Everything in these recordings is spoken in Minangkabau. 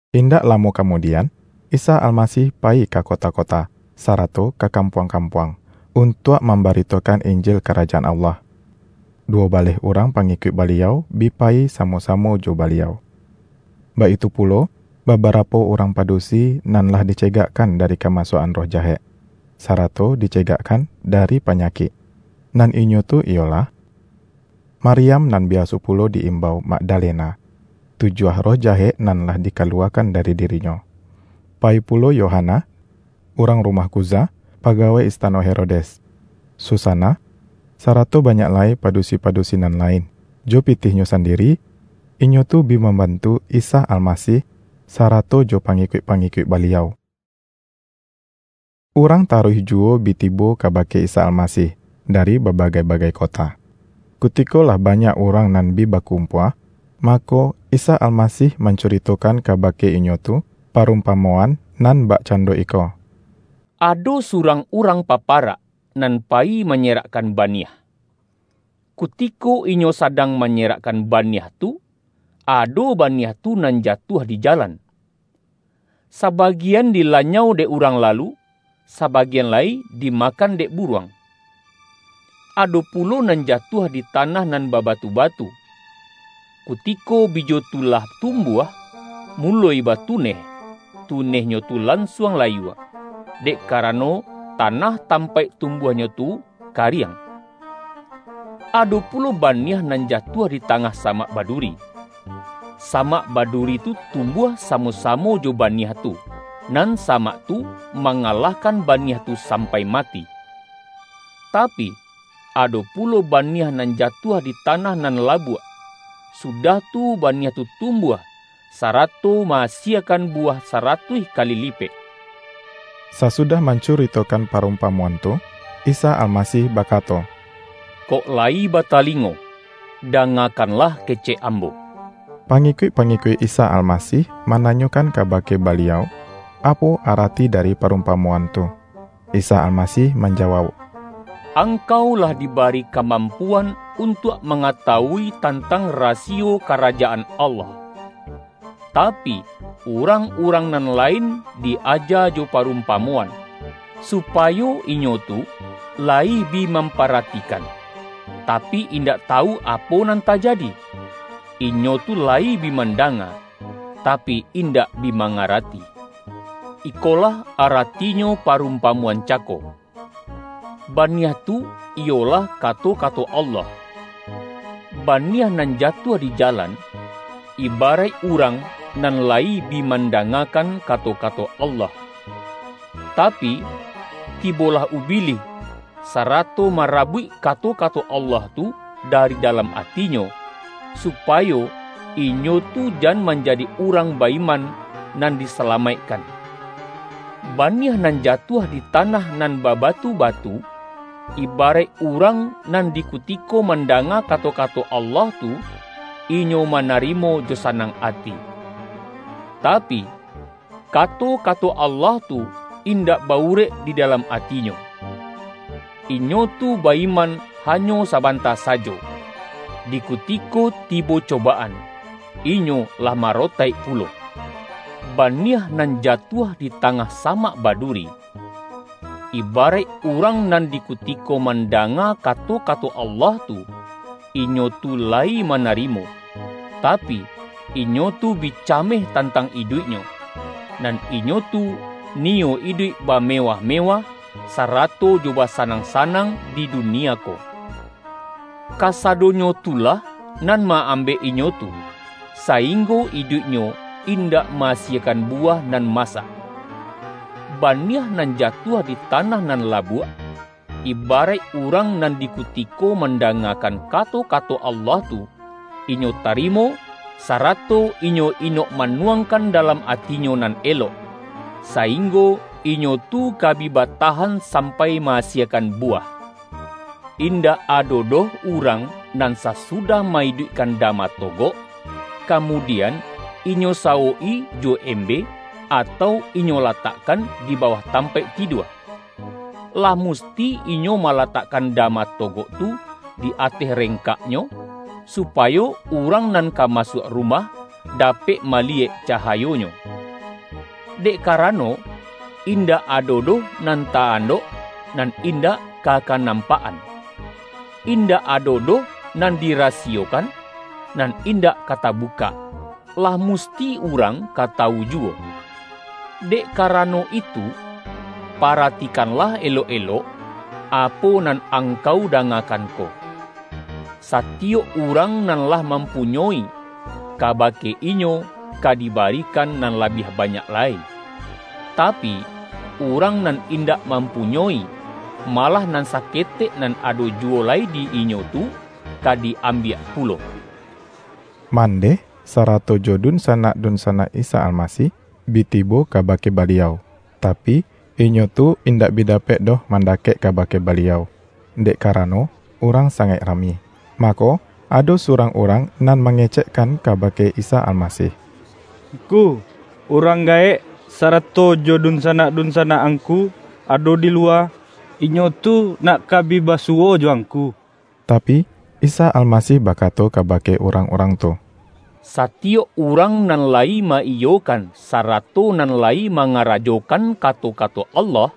Indak lamo kamudian, Isa Almasih payi ka kota-kota, sarato ka kam-puang-kampuang, untuak mambaritokan Injil Karajaan Allah. Duwo baleh urang pangikuik Baliau bi payi samo-samo jo Baliau. Baitu pulo, babarapo urang pa-dusi nan lah dicegakkan dari kamasuak-an roh jahek, sarato dicegakkan dari pa-nyakik. Nan inyo tu iyolah, Maryam nan biaso pulo di-imbau Magdalena, (tujuah roh jahek nan lah dikaluwakan dari di-rinyo); payi pulo Yohana, urang rumah Khuza, pagawai istano Herodes; Susana, sarato banyak lai padusi-padusi nan lain. Jo pitihnyo sandiri, inyo tu bi mambantu Isa Almasih, sarato jo pangikuik-pangi-kuik Baliau. Urang taruih juwo bi tibo kabake Isa Almasih, dari babagai-bagai kota. Kutiko lah banyak urang nan bi ba-kumpua, mako, Isa Almasih mancu-ritokan kabake inyo tu, parumpamo-an nan bakcando iko: ”Ado surang urang paparak, nan payi manyerak-kan baniah. Kutiko inyo sadang ma-nyerakkan baniah tu, ado baniah tu nan jatuah di jalan. Sabagian dilanyau dek urang lalu, sabagian lai dimakan dek buruang. Ado pulo nan jatuah di tanah nan babatu-batu. Kutiko bijo tu lah tumbuah, muloi batuneh, tuneh-nyo tu lansuang layua, dek karano ta-nah tampaik tumbuahnyo tu kariang. Ado pulo baniah nan jatuah di tangah samak baduri. Samak baduri tu tum-buah samo-samo jo baniah tu, nan sa-mak tu, mangalahkan baniah tu sam-pai mati. Tapi, ado pulo baniah nan jatuah di tanah nan labuak, sudah tu, baniah tu tumbuah, sarato ma-asiekan buwah saratuih kali lipek.” Sasudah mancuritokan parumpamo-an tu, Isa Almasih bakato,”Kok layi ba-talingo, dangakanlah kecek Ambo!” Pangikuik-pangikuik Isa Almasih mananyokan kabake Baliau, apo arati dari parumpamoan tu. Isa Almasih manjawauk,”Angkau lah dibari ka-mampuan untuak mangatawui tantang rasiyo Karajaan Allah. Tapi, urangurang nan lain di-aja jo parumpamo-an, supayo inyo tu layi bi mamparati-kan, tapi, indak tawu apo nan tajadi; inyo tu layi bi mandanga, tapi, indak bi mangarati.” ”Ikolah aratinyo parumpamoan ca-ko: Baniah tu, iyolah kato-kato Allah. Baniah nan jatuah di jalan, ibaraik urang nan layi bi mandangakan kato-kato Allah. Tapi, tibolah Ubilih, sarato marabuik kato-kato Allah tu dari da-lam atinyo, supayo inyo tu jan man-jadi urang ba-iman, nan disalamaik-kan. Baniah nan jatuah di tanah nan babatu-batu, ibaraik urang nan di kutiko mandanga kato-kato Allah tu, inyo manarimo jo sanang ati. Ta-pi, kato-kato Allah tu indak ba-urek di dalam atinyo. Inyo tu ba-iman ha-nyo sabanta sajo, di kutiko tibo coba-an, inyo lah marotaik pulo. Baniah nan jatuah di tangah samak baduri, ibaraik urang nan di kutiko mandanga kato-kato Allah tu, inyo tu layi mana-rimo, tapi, inyo tu bi cameh tantang iduiknyo, nan inyo tu niyo iduik ba-mewah-mewah, sarato jo basanang-sanang di dunia ko. Kasadonyo tu lah nan ma-ambek inyo tu, sainggo iduik-nyo indak ma-asiekan buwah nan ma-sak. Baniah nan jatuah di tanah nan labuak, ibaraik urang nan di kutiko mandangakan kato-kato Allah tu, inyo tarimo, sarato inyo inok manuangkan dalam atinyo nan elok, sainggo inyo tu ka bi batahan sampai ma-asiekan buwah.” ”Indak ado doh urang nan sasu-dah ma-iduikkan dama togok, kamu-dian inyo sawok-i jo embe, atau inyo latakkan di bawah tampaik tidua. Lah musti inyo malatakkan dama togok tu di ateh rengkaknyo, supayo urang nan ka masuak rumah dapek mali-yek cahayonyo. Dek karano, indak ado doh nan ta-andok, nan indak ka kanampak-an; indak ado doh nan di-rasiyokan, nan indak ka tabukak, lah musti urang ka tawu juwo. Dek karano itu, paratikanlah elok-elok, apo nan angkau dangakan ko. Sa-tiyok urang nan lah mampunyoi, kaba-ke inyo ka dibarikan nan labiah banyak lai; tapi, urang nan indak mampunyoi, malah, nan saketek nan ado juwo lai di inyo tu, ka di-ambiak pulo.” Mandeh, sarato jo dunsanak-dun-sanak Isa Almasih, bi tibo kabake Ba-liau, tapi, inyo tu indak bi dapek doh mandakek kabake Baliau, dek karano urang sangaik rami. Mako, ado su-rang urang nan mangecekkan kaba-ke Isa Almasih,”Ngku, urang gaek, sarato jo dunsanak-dunsanak Angku ado di luwa. Inyo tu nak ka bi basu-wo jo Angku.” Tapi, Isa Almasih bakato kabake urang-urang tu,”Satiyok urang nan la-yi ma-iyokan, sarato nan layi manga-rajokan kato-kato Allah,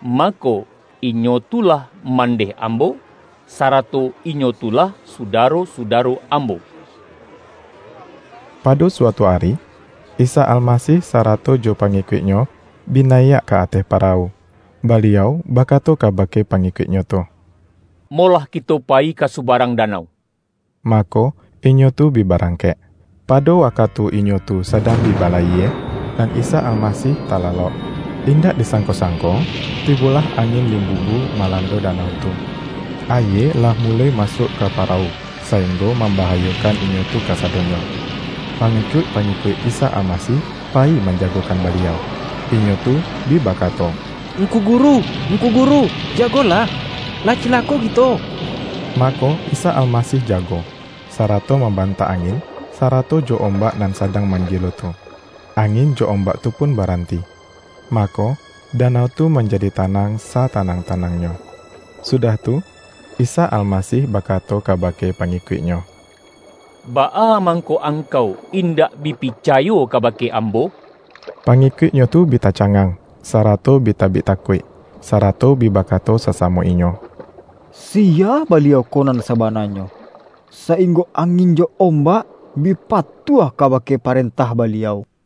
mako, inyo tu lah mandeh Ambo, sarato inyo tu lah sudaro-sudaro Ambo.” Pado suatu ari, Isa Almasih sa-rato jo pangikuik-Nyo bi nayiak ka ateh parawu. Baliau bakato kabake pangikuik-Nyo tu,”Molah kito payi ka subarang danau.” Mako, inyo tu bi barangkek. Pado wakatu inyo tu sa-dang bi balayie, nan Isa Almasih ta-lalok. Indak disangko-sangko, tibolah angin limbubu malando danau tu. Ayie lah muloi masuak ka parawu, saing-go mambahayokan inyo tu kasadonyo. Pangikuik-pangikuik Isa Almasih payi manjagokan Baliau. Inyo tu bi ba-kato,”Ngku Guru, Ngku Guru, jagolah, lah cilako kito!” Mako, Isa Almasih jago, sarato mam-bantak angin, sarato jo ombak nan sa-dang manggilo tu. Angin jo ombak tu pun baranti, mako, danau tu manjadi tanang, satanang-tanangnyo. Sudah tu, Isa Almasih bakato kabake pangi-kuik-Nyo,”Baa mangko angkau indak bi picayo kabake Ambo?” Pangikuik-Nyo tu bi tacangang, sa-rato bi tabik takuik. Sarato bi bakato sasamo inyo,”Siya Baliau ko nan sa-bananyo, sainggo angin jo ombak, bi patuah kabake parentah Baliau!”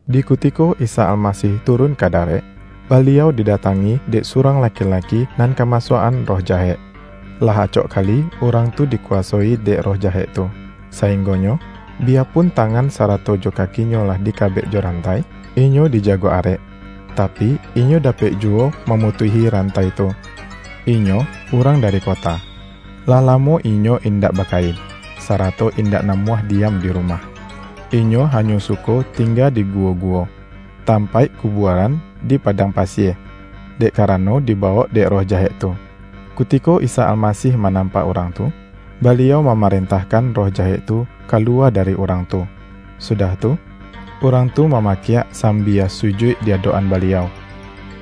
Di kutiko Isa Almasih turun ka darek, Baliau didatangi dek surang laki-laki nan kamasuak-an roh jahek. Lah acok kali urang tu dikuwasoi dek roh jahek tu, sainggonyo, biyapun ta-ngan sarato jo kakinyo lah dikabek jo rantai, inyo dijago arek, tapi, inyo da-pek juwo mamutuihi rantai tu. Inyo urang dari kota. Lah lamo inyo indak bakain, sarato indak namuah diam di rumah. Inyo hanyo suko tingga di gu-wo-guwo, tampaik kubuaran di padang pasie, dek karano dibawok dek roh ja-hek tu. Kutiko Isa Almasih manampak urang tu, Baliau mamarentahkan roh jahek tu kaluwa dari urang tu. Sudah tu, urang tu mamakiak sambia sujuik di adok-an Baliau,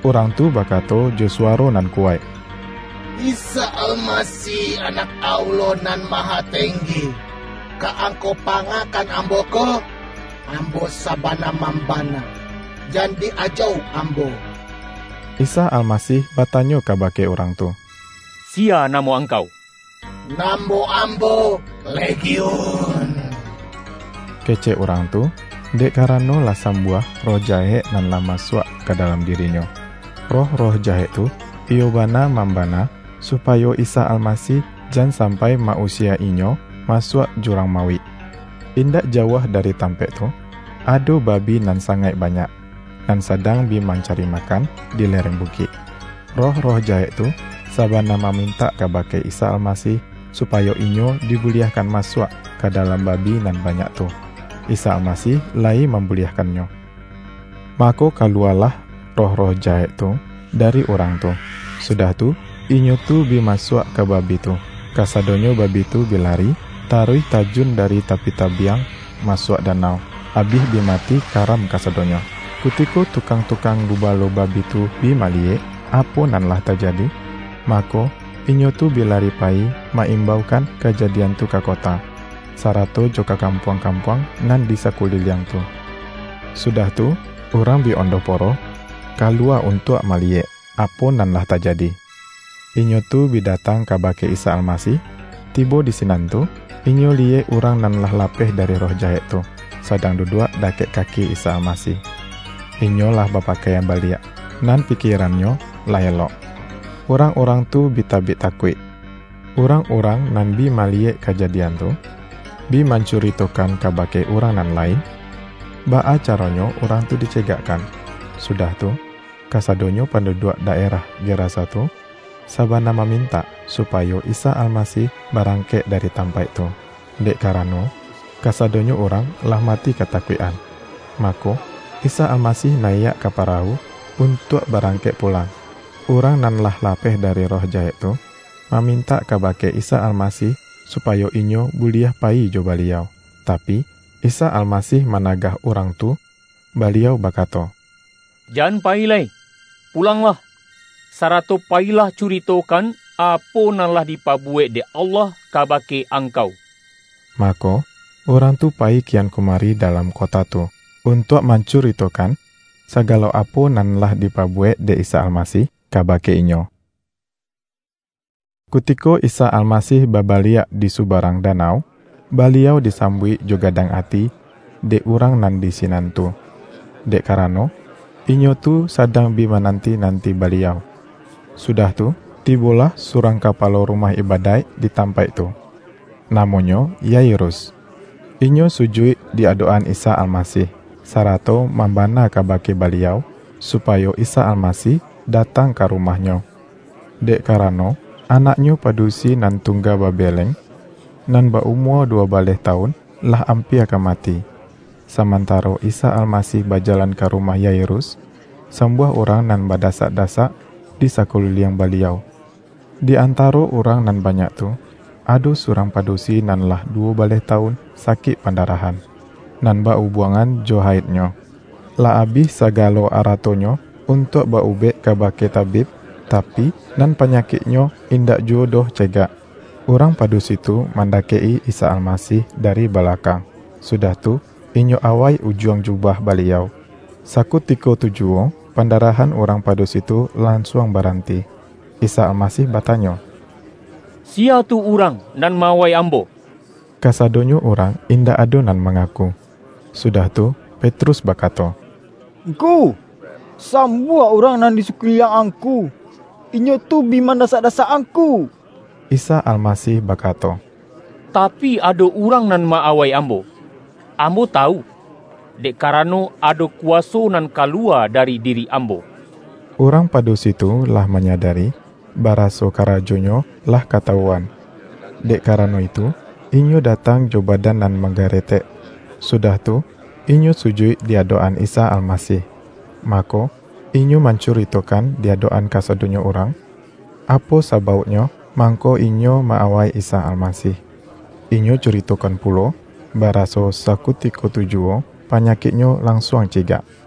urang tu bakato jo suwaro nan kuwaik,”Isa Almasih, Anak Allah Nan Maha Tenggi! Ka Ang-kau pangakan ambo ko? Ambo sabana mambana, jan di-ajauk ambo!” Isa Almasih batanyo kabake urang tu,”Siya namo angkau?””Namo ambo ’Legiun’,” kecek urang tu dek karano lah sambuah roh ja-hek nan lah masuak ka dalam dirinyo. Roh-roh jahek tu iyo bana mamba-na, supayo Isa Almasih jan sampai ma-usie inyo masuak Jurang Mauik. Indak jauah dari tampaik tu, ado babi nan sangaik banyak, nan sadang bi mancari makan di lereng bukik. Roh-roh jahek tu, sabana mamintak kabake Isa Almasih, supayo inyo di-buliahkan masuak ka dalam babi nan banyak tu. Isa Almasih layi mambu-liahkannyo. Mako kaluwalah roh-roh jahek tu dari urang tu, sudah tu, inyo tu bi masuak ka babi tu. Kasa-donyo babi tu bi lari, taruih tajun da-ri tapi tabiang masuak danau, abih bi mati karam kasadonyo. Kutiko tukang-tukang gubalo babi tu bi maliyek, apo nan lah tajadi. Ma-ko, inyo tu bi lari payi ma-imbaukan kajadian tu ka kota, sarato jo ka kam-puang-kampuang nan di sakuliliang tu. Sudah tu, urang bi ondoh-po-roh kaluwa untuak maliyek, apo nan lah tajadi. Inyo tu bi datang kabake Isa Almasih, tibo di sinan tu, inyo li-yek urang nan lah lapeh dari roh ja-hek tu, sadang duduak dakek kaki Isa Almasih. Inyo lah bapakaian baliak, nan pikierannyo lah elok. Urang-urang tu bi tabik takuik. Urang-urang nan bi maliyek kajadian tu, bi mancurito-kan kabake urang nan lain, baa ca-ronyo urang tu dicegakkan. sudah tu, kasadonyo panduduak daerah Ge-rasa tu sabana mamintak, supayo Isa Almasih barangkek dari tampaik tu, dek karano, kasadonyo urang lah mati katakuik-an. Mako, Isa Almasih nayiak ka parawu, untuak barangkek pulang. Urang nan lah lapeh dari roh jahek tu, mamintak kabake Isa Almasih su-payo inyo buliah payi jo Baliau. Tapi, Isa Almasih managah urang tu, Baliau bakato, ”Jan payi lai, pu-langlah, sarato payilah curitokan, apo nan lah dipabuwek dek Allah kaba-ke angkau.” Mako, urang tu payi kian kumari dalam kota tu, untuak mancuritokan, sagalo apo nan lah dipabuwek dek Isa Almasih, kabake inyo. Kutiko Isa Almasih babaliak di subarang danau, Baliau disambuik jo gadang ati dek urang nan di sinan tu, dek karano, inyo tu sadang bi ma-nanti-nanti Baliau. Sudah tu, tibo-lah surang kapalo rumah ibadaik di tampaik tu. Namonyo Yairus. Inyo su-juik di adok-an Isa Almasih, sarato mambana kabake Baliau, supayo Isa Almasih datang ka rumahnyo, dek karano, anaknyo padusi nan tungga babeleng, nan ba-umua duwo baleh tawun, lah ampia ka mati. Samantaro Isa Almasih bajalan ka rumah Yairus, sambuah urang nan badasak-dasak di sakuliliang Baliau. Di antaro urang nan banyak tu, ado surang padusi nan lah duwo baleh ta-wun sakik pandarahan, nan ba-ubuang-an jo haidnyo. Lah abih sagalo arato-nyo untuak ba-ubek kabake tabib, tapi, nan panyakiknyo indak juwo doh ce-gak. Urang padusi tu mandakek-i Isa Almasih dari balakang, sudah tu, inyo awai ujuang jubah Baliau. Sakutiko tu juwo, pandarahan urang padusi tu lan-suang baranti. Isa Almasih batanyo,”Siya tu urang nan ma-awai Ambo?” Kasadonyo urang indak ado nan mangaku. Sudah tu, Petrus bakato,”Ngku, sambuah urang nan di saku-liliang Angku; inyo tu bi mandasak-dasak Angku!” Isa Almasih bakato,”Tapi, ado urang nan ma-awai Ambo, Ambo ta-wu, dek karano ado kuwaso nan ka-luwa dari diri Ambo.” Urang padu-si tu lah manyadari, baraso karajonyo lah katawuan. Dek karano itu, inyo da-tang jo badan nan manggaretek, sudah tu, inyo sujuik di adok-an Isa Almasih. Mako, inyo mancuritokan di adok-an kasadonyo urang, apo sabauknyo mangko inyo ma-awai Isa Almasih, inyo curitokan pulo, baraso sakutiko tu juwo panyakiknyo lansuang cegak.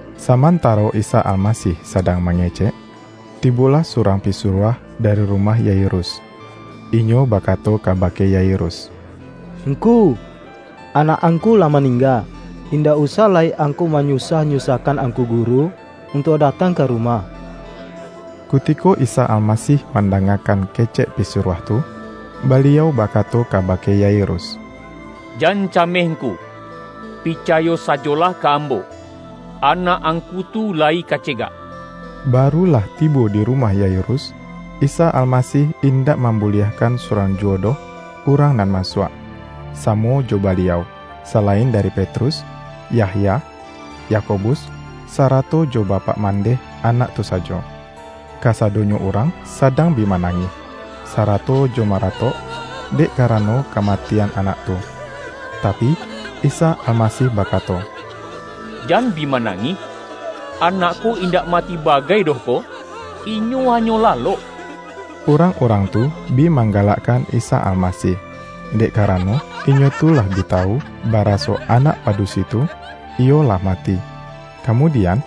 Samantaro Isa Almasih sadang ma-ngecek tibolah surang pisuruah dari ru-mah Yairus. Inyo bakato kabake Yairus,”Ngku, anak angku lah maningga. Indak usah lai angku manyusah-nyusahkan Angku Guru, untuak datang ka rumah.” Kutiko Isa Almasih mandangakan kecek pisuruah tu, Baliau bakato kabake Yairus,”Jan cameh ngku. Picayo sajolah ka Ambo, anak angku tu layi ka cegak.” Baru lah tibo di rumah Yairus, Isa Almasih indak mambuliahkan surang ju-wo doh urang nan masuak, samo jo Baliau, salain dari Petrus, Yahya, Yakobus, sara-to jo bapak mandeh anak tu sajo. Kasa-donyo urang sadang bi manangih, sara-to jo maratok, dek karano kamatian anak tu. Tapi, Isa Almasih bakato,”Jan bi ma-nangih. Anak ko indak mati bagai doh ko, inyo hanyo lalok!” Urang-urang tu bi manggalakkan Isa Almasih, dek karano inyo tu lah bi ta-wu, baraso anak padusi tu, iyo lah ma-ti. Kamudian,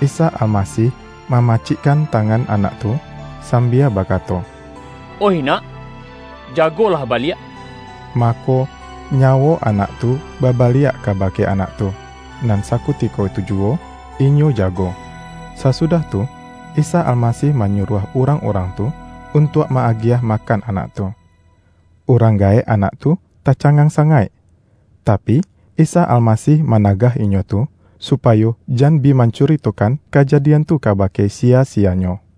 Isa Almasih mamacik-kan tangan anak tu, sambia bakato,”Oih nak, jagolah baliak!” Mako, nyawo anak tu babaliak kabake anak tu, nan sa-kutiko tu juwo inyo jago. Sasudah tu, Isa Almasih manyuruah urang-urang tu, un-tuak ma-agiah makan anak tu. Urang gaek anak tu tacangang sangaik. Tapi, Isa Almasih managah inyo tu, supayo jan bi mancuritokan kajadian tu kabake siya-siyanyo.